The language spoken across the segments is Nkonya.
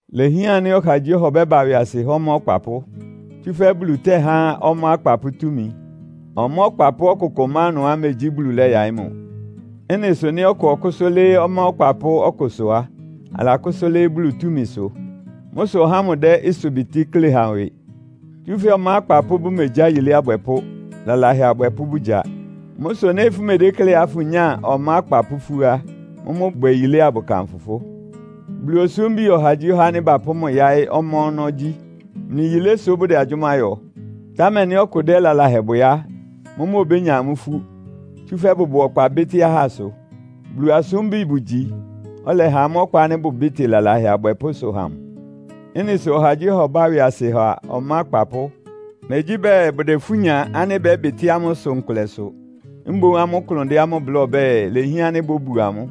Ilehián ánɩ́ ɔhagyíɔha ɔbɛ́ba ɩwɩasɩ há ɔmá akpapʋ́. Tsúfɛ́ Bulu tɛ́há ɔmá akpapʋ́ túmi. Ɔmá ɔkpapʋ́ ɔkʋkʋ má ɩnʋá megyí Bulu lɛ́yaɩ́ mʋ. Ɩ́nɩ sʋ nɩ́ ɔkʋ ɔkʋ́sʋ́ lɩ́ɩ́ ɔmá ɔkpapʋ́ ɔkʋsʋ á, alakʋ́sʋ́ lɩ́ɩ́ Bulu túmisʋ. Mʋ́ sʋ ɔhá ámʋ dɛ́ ɩsʋbɩtɩ́ klé ha ɩwɩ. Tsúfɛ́ ɔmá akpapʋ́ bʋmegyá yilé abwɛpʋ́, lalahɛ abwɛpʋ́ bʋgya. Mʋ́ sʋ nɩ́ fʋmedékleá fʋnyáa ɔmá akpapʋ́ ifú á, mʋ́mʋ́ bwɛ yilé abʋkanfʋ fʋ́. Bulu osúmbi ɔhagyíɔha ánɩ́ bapʋ́ mʋ yáɩ́ ɔmá ɔnɔ́ gyí. Mlɩ yilé sʋ bʋdɛ agyʋ́má yɔ. Támɛ nɩ́ ɔkʋ dɛ́ lalahɛ bwɛ á, mʋ́mʋ́ obénya amʋ́ ifú, tsúfɛ́ bʋbʋ ɔkpa bɩ́tɩ́ ahá ɩsʋ. Bulu asúmbi bʋgyi, ɔlɛha amʋ́ ɔkpa ánɩ́ bʋbɩ́tɩ lalahɛ abwɛpʋ́ ɩsʋ ha mʋ. Ɩ́nɩ sʋ ɔhagyíɔha ɔbá ɩwɩasɩ ha ɔmá akpapʋ́. Megyí bɛɛ bʋdɛ ifú nya ánɩ́ bɛ́bɩtɩ́ amʋ́ ɩsʋ nkʋlɛ sʋ. Mboún amʋ́ klʋn dɛ́ amʋ́ bláa ɔbɛ́ɛ, ilehián ánɩ́ bóbu amʋ́.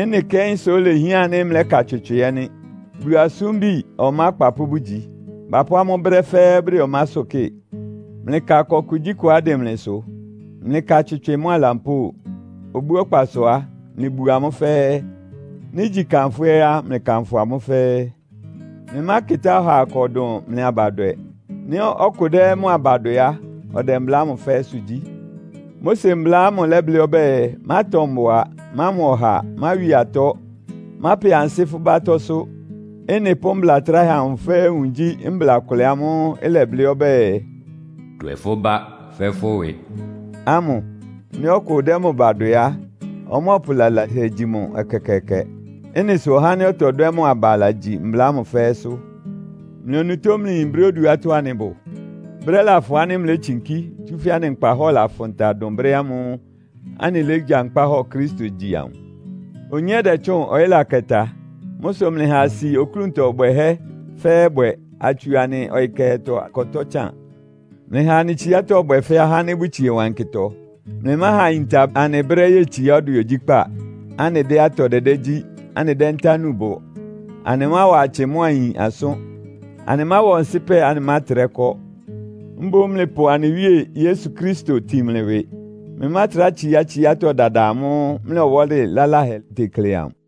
Ɩ́nɩ kɛ́n sʋ́ ilehián ánɩ́ mlɛ́ka tswɩtswɩ ɛ́ nɩ́. Bulu asúmbi ɔmá akpapʋ́ bʋgyi. Bapʋ́ amʋ́ brɛ́ fɛ́ɛ́ bʋdɛ ɔmásʋ́ kɩ́ɩ. Mlɩka ɩkɔ kugyíkʋá ɩdɩn mlɩsʋ. Mlɩka tswɩtswɩ mʋ́a lampóo. Obú ɔkpasʋ á, mlɩbu amʋ́ fɛ́ɛ́. Nɩ́ igyi kanfʋ́ ɛ́ á, mlɩkanfʋ amʋ́ fɛ́ɛ́. Mlɩmákɩtá ɔhaa ɩkɔ dʋn mlɩ abadwɛ. Nɩ́ ɔkʋ dɛ́ mʋ aba dwɛ á, ɔdɛ mbla ámʋ fɛ́ɛ́sʋ́ gyí. Mose Mbla ámʋ lɛ́blɩ́ ɔbɛ́ɛ, “Mátɔ mbʋa.” “Mámɔ ɔha.” “Máwi atɔ́.” “Mápɛ ansɩ́ fʋ́ ba atɔ́sʋ́.” Ɩ́nɩ pʋ́ mbla tráhɛ amʋ fɛ́ɛ́ nwun gyí mbla kʋlɛ ámʋ́ʋ́ ɩlɛblɩ́ ɔbɛ́ɛ, “Dwɛ fʋ́ bá fɛ́ fʋ́ ɩwɩ” ámʋ. Nɩ́ ɔkʋ dɛ́ mʋ ba dwɛ á, ɔmɔ́ɔpʋ lalahɛ gyi mʋ ɛkɛkɛɛkɛ. Ɩ́nɩ sʋ ɔhá ánɩ́ ɔtɔdwɛ́ mʋ aba lagyi mbla ámʋ fɛ́ɛ́sʋ́. Mlɩ onutó mlɩyin brɛ́ oduátɔ́ anɩbʋ. Brɛ́ lafʋn ánɩ́ mlétsinkí, tsúfɛ́ anɩ nkpahɔ́ɔ lafʋn ta dʋn brɛ́ ámʋ́ʋ́ anɩlégyankpá hɔ Kristo gyi amʋ. Onyé dɛtsʋ́ʋn, ɔyɩ́ lakɛ ta. Mʋ́ sʋ mlɩha asi oklúntɔ bwɛhɛ́ fɛ́ɛ́ bwɛ, atsu anɩ ɔyɩ kɛhɛtɔ akɔtɔ́ tsan. Mlɩha anɩ tsíátɔ́ ɩbwɛ fɛ́ ahá ánɩ́ bʋtsie wankɩtɔ. Mlɩmáha ayinta anɩ brɛ́ yetsiá ɔdwɛ ogyíkpá, anɩdɛ́ atɔ dɛdɛ́ gyí, anɩdɛ́ ntá núu bʋ. Anɩmáwa atsɩ mʋ́a ayin asʋ́n. Anɩmáwa ɔnsɩ́pɛ, anɩmátrɛ kɔ́. Mboún mlɩpʋ anɩ Wíe Yesu Kristo tin mlɩ ɩwɩ. Mlɩmátrá tsiá tsiátɔ́ dada amʋ́ʋ́ mlɩ ɔwɔ́lɩ laláhɛ tekle amʋ.